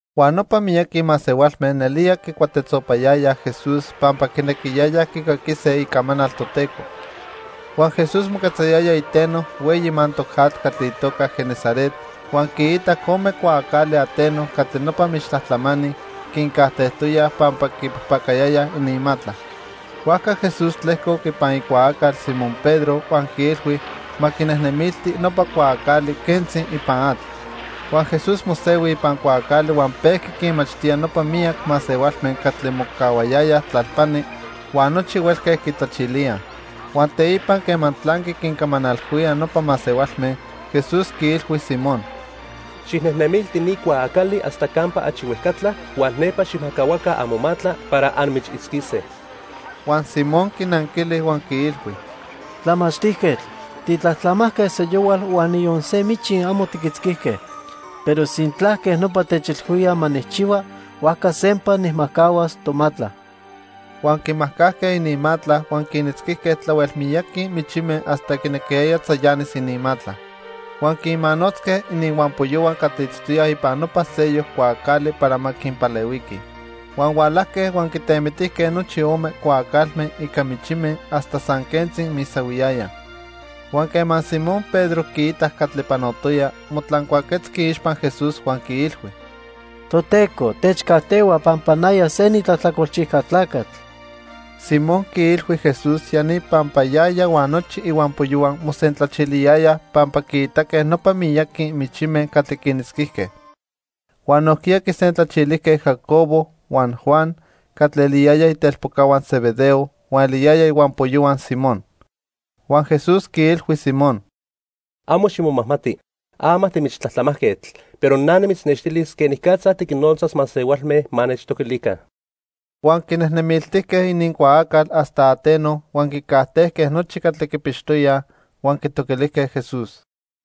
Huan nopa miyaqui masehualme nelía quicuatetzopayayaj Jesús pampa quinequiyayaj quicaquise icamanal Toteco. Huan Jesús moquetzayaya iteno hueyi mantoc atl catli itoca Genesaret, huan quiitac ome cuaacali ateno catli nopa michtlajtlamani quincajtejtoyaj pampa quipajpacayayaj ininmatla. Huajca Jesús tlejcoc ipan icuaacal Simón Pedro huan quiilhui ma quinejnemilti nopa cuaacali quentzi ipan atl. Huan Jesús mosehui ipan cuaacali huan pejqui quinmachtía nopa miyac masehualme catli mocahuayayaj tlalpani huan nochi huelque quitlachilíaj. Huan teipa quema tlanqui quincamanalhuía nopa masehualme, Jesús quiilhui Simón: —Xijnejnemilti ni cuaacali hasta campa achi huejcatla huan nepa xijmajcahuaca amomatla para anmichitzquise. Huan Simón quinanquili huan quiilhui: —Tlamachtijquetl, titlajtlamajque seyohual huan niyon se michi amo tiquitzquijque. Pero sintla quej nopa techilhuía ma nijchihua, huajca sempa nijmajcahuas tomatla. Huan quimajcajque ininmatla, huan quinitzquijque tlahuel miyaqui michime hasta quinequiyaya tzayanis ininmatla. Huan quinmanotzque ininhuampoyohua catli itztoyaj ipan nopa seyoc cuaacali para ma quinpalehuiquij. Huan hualajque huan quitemitijque nochi ome cuaacalme ica michime hasta san quentzi misahuiyayaj. Huan quema Simón Pedro quiitac catli panotoya, motlancuaquetzqui iixpa Jesús huan quiilhui: —Toteco, techcajtehua pampa naya se nitlajtlacolchijca tlacatl. Simón quiilhui Jesús ya ni pampa yaya huan nochi ihuampoyohua mosentlachiliyayaj pampa quiitaque nopa miyaqui michime catli quinitzquijque. Huan nojquiya quisentlachilijque Jacobo huan Juan catli eliyaya itelpocahua Zebedeo huan eliyayaj ihuampoyohua Simón. Huan Jesús quiilhui Simón: —Amo ximomajmati. Ama timichtlajtlamajquetl, pero na nimitznextilis quenicatza tiquinnotzas masehualme ma nechtoquilica. Huan quinejnemiltijque inincuaacal hasta ateno, huan quicajtejque nochi catli quipixtoyaj huan quitoquilijque Jesús.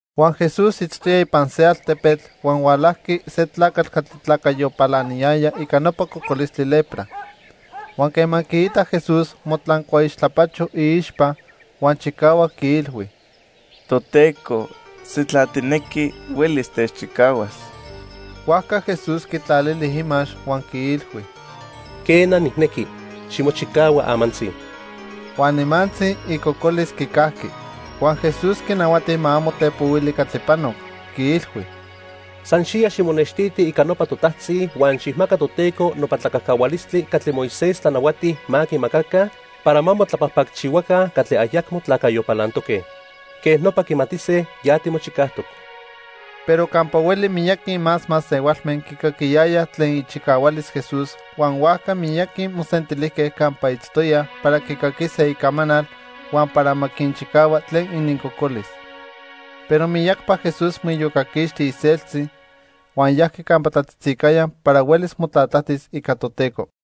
Huan Jesús itztoya ipan se altepetl, huan hualajqui se tlacatl catli tlacayo palaniyaya ica nopa cocolistli lepra. Huan quema quiitac Jesús, motlancuaixtlapacho iixpa huan chicahuac quiilhui: —Toteco, sintla tijnequi, huelis techchicahuas. Huajca Jesús quitlalili imax huan quiilhui: —Quena, nijnequi. Ximochicahua amantzi. Huan nimantzi icocolis quicajqui. Huan Jesús quinahuati ma amo tepohuili catli panoc, quiilhui: —San xiya ximonextiti ica nopa totajtzi huan xijmaca Toteco nopa tlacajcahualistli catli Moisés tlanahuati ma quimacaca para ma motlapajpacchihuaca catli ayacmo tlacayo palantoque. Quej nopa quimatise ya timochicajtoc. Pero campa hueli miyaqui más masehualme quicaquiyayaj tlen ichicahualis Jesús huan huajca miyaqui mosentilijque campa itztoya para quicaquise icamanal huan para ma quinchicahua tlen inincocolis. Pero miyacpa Jesús moiyocaquixti iseltzi huan yajqui campa tlatzitzicaya para huelis motlatlajtis ica Toteco.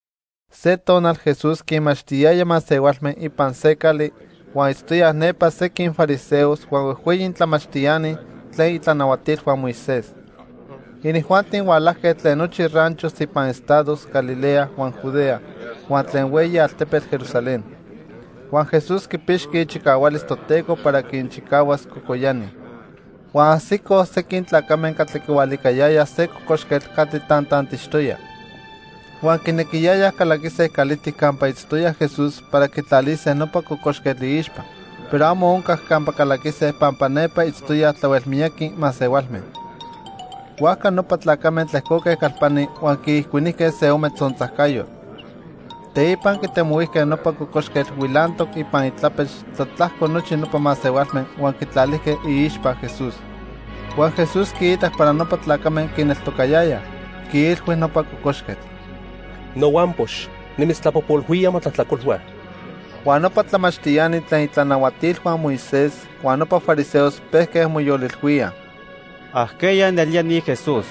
Se tonal Jesús quinmachtiyaya masehualme ipan se cali, huan itztoyaj nepa sequin fariseos huan huejhueyi tlamachtiani tlen itlanahuatilhua Moisés. Inijuanti hualajque tlen nochi ranchos ipan estados Galilea huan Judea, huan tlen hueyi altepetl Jerusalén. Huan Jesús quipixqui ichicahualis Toteco para quinchicahuas cocoyani. Huan ajsicoj sequin tlacame catli quihualicayayaj se cocoxquetl catli tantantixtoya. Huan quinequiyayaj calaquise calijtic campa itztoya Jesús para quitlalise nopa cocoxquetl iixpa, pero amo oncac campa calaquise pampa nepa itztoyaj tlahuel miyaqui masehualme. Huajca nopa tlacame tlejcoque calpani huan quiijcuinijque se ome tzontzajcayotl. Teipa quitemohuijque nopa cocoxquetl huilantoc ipan itlapech tlatlajco nochi nopa masehualme huan quitlalijque iixpa Jesús. Huan Jesús quiitac para nopa tlacame quineltocayayaj, quiilhui nopa cocoxquetl: —Nohuampox, nimitztlapojpolhuía motlajtlacolhua. Huan nopa tlamachtiani tlen itlanahuatilhua Moisés huan nopa fariseos pejque moyolilhuíaj: "¿Ajqueya nelía ni Jesús?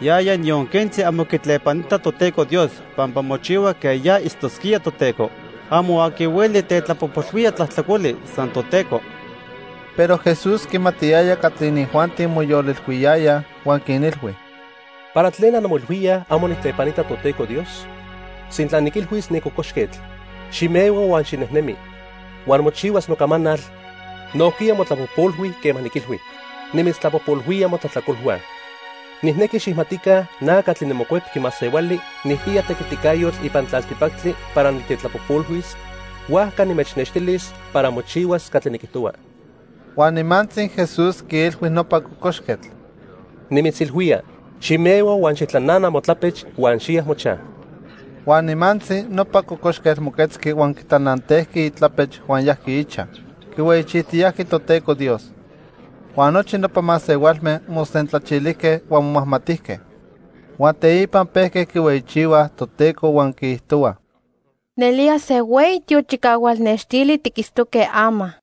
Yaya niyon quentzi amo quitlepanita Toteco Dios pampa mochihua quen ya itztosquía Toteco. Amo aqui hueli tetlapojpolhuía tlajtlacoli, san Toteco." Pero Jesús quimatiyaya catli inijuanti moyolilhuiyayaj huan quinilhui: —¿Para tlen anmoilhuíaj amo nijtlepanita Toteco Dios? Sintla niquilhuis ni cocoxquetl: 'Ximehua huan xinejnemi' huan mochihuas nocamanal, nojquiya motlapojpolhui quema niquilhui: 'Nimitztlapojpolhuía motlajtlacolhua.' Nijnequi xijmatica na catli niMocuepqui Masehuali nijpiya tequiticayotl ipan tlaltipactli para nitetlapojpolhuis, huajca nimechnextilis para mochihuas catli niquijtohua. Huan nimantzi Jesús quiilhui nopa cocoxquetl: —Nimitzilhuía, ximehua huan xijtlanana motlapech huan xiya mochaj. Huan nimantzi nopa cocoxquetl moquetzqui huan quitlanantejqui itlapech huan yajqui ichaj, quihueyichijtiyajqui Toteco Dios. Huan nochi nopa masehualme mosentlachilijque huan momajmatijque. Huan teipa pejque quihueyichihuaj Toteco huan quiijtohuaj: —Nelía se hueyi tiochicahual nextili tiquitztoque ama.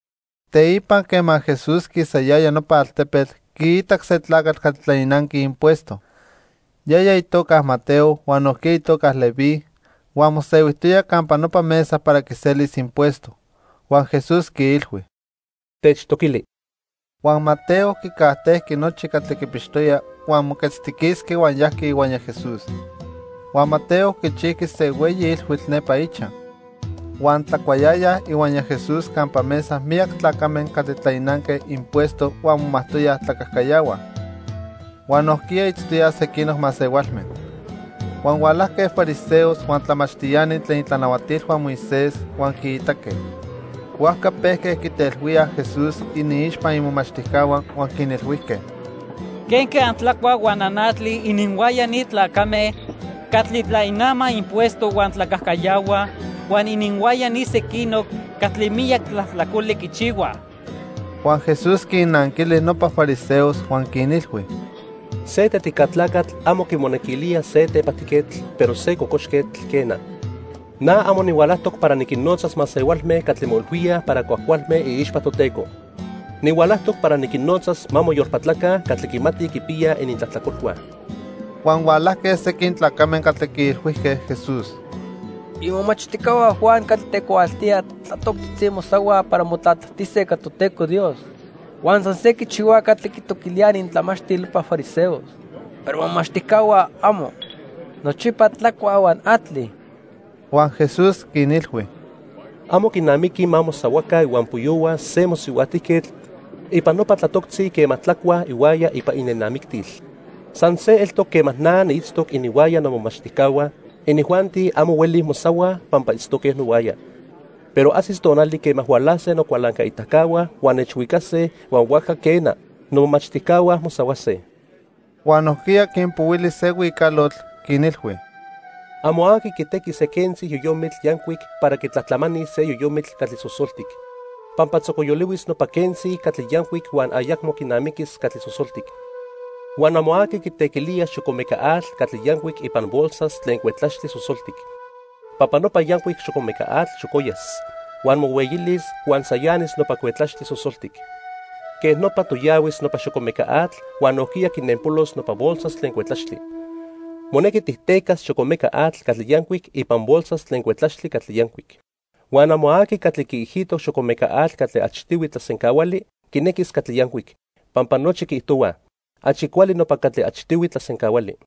Teipa quema Jesús quisayaya nopa altepetl, quiitac se tlacatl catli tlainanqui impuesto. Yaya itoca Mateo huan nojquiya itoca Leví, huan mosehuijtoya campa nopa mesa para quiselis impuesto. Huan Jesús quiilhui: —Techtoquili. Huan Mateo quicajtejqui nochi catli quipixtoya, huan moquetztiquisqui huan yajqui ihuaya Jesús. Huan Mateo quichijqui se hueyi ilhuitl nepa ichaj. Huan tlacuayayaj ihuaya Jesús campa mesa miyac tlacame catli tlainanque impuesto huan momajtoyaj tlacajcayahuaj. Huan nojquiya itztoyaj sequinoc masehualme. Huan hualajque fariseos huan tlamachtiani tlen itlanahuatilhua Moisés huan quiitaque. Huajca pejque quitelhuíaj Jesús iniixpa imomachtijcahua huan quinilhuijque: —¿Quenque antlacuaj huan anatlij ininhuaya ni tlacame catli tlainamaj impuesto huan tlacajcayahuaj huan ininhuaya ni sequinoc catli miyac tlajtlacoli quichihuaj? Huan Jesús quinnanquili nopa fariseos huan quinilhui: —Se tetica tlacatl amo quimonequilía se tepajtijquetl, pero se cocoxquetl, quena. Na amo nihualajtoc para niquinnotzas masehualme catli moilhuíaj para cuajcualme iixpa Toteco. Nihualajtoc para niquinnotzas ma moyolpatlaca catli quimatij quipiyaj inintlajtlacolhua. Huan hualajque sequin tlacame catli quiilhuijque Jesús: —Imomachtijcahua Juan catli tecuaaltía tlatoctzitzi mosahuaj para motlatlajtise ica Toteco Dios. Huan san se quichihuaj catli quitoquilíaj inintlamachtil nopa fariseos, pero momomachtijcahua amo. Nochipa tlacuaj huan atlij. Huan Jesús quinilhui: —Amo quinamiqui ma mosahuaca ihuampoyohua se mosihuajtijquetl ipan nopa tlatoctzi quema tlacuaj ihuaya ipan inenamictil. San se eltoc quema na niitztoc ininhuaya nomomachtijcahua, inijuanti amo huelij mosahuaj pampa itztoque nohuaya. Pero ajsis tonali quema hualase nocualancaitacahua huan nechhuicase huan huajca quena, nomomachtijcahua mosahuase. Huan nojquiya quinpohuili se huicalotl, quinilhui: —Amo aqui quitequi se quentzi yoyomitl yancuic para quitlatlamanis se yoyomitl catli sosoltic, pampa tzocoyolihuis nopa quentzi catli yancuic huan ayacmo quinamiquis catli sosoltic. Huan amo aqui quitequilía xocomeca atl catli yancuic ipan bolsas tlen cuetlaxtli sosoltic. Pampa nopa yancuic xocomeca atl xocoyas, huan mohueyilis huan tzayanis nopa cuetlaxtli sosoltic. Quej nopa toyahuis nopa xocomeca atl huan nojquiya quinenpolos nopa bolsas tlen cuetlaxtli. Monequi tijtecas xocomeca atl catli yancuic ipan bolsas tlen cuetlaxtli catli yancuic. Huan amo aqui catli quiijitoc xocomeca atl catli achtihui tlasencahuali quinequis catli yancuic, pampa nochi quiijtohuaj: 'Achi cuali nopa catli achtihui tlasencahuali.'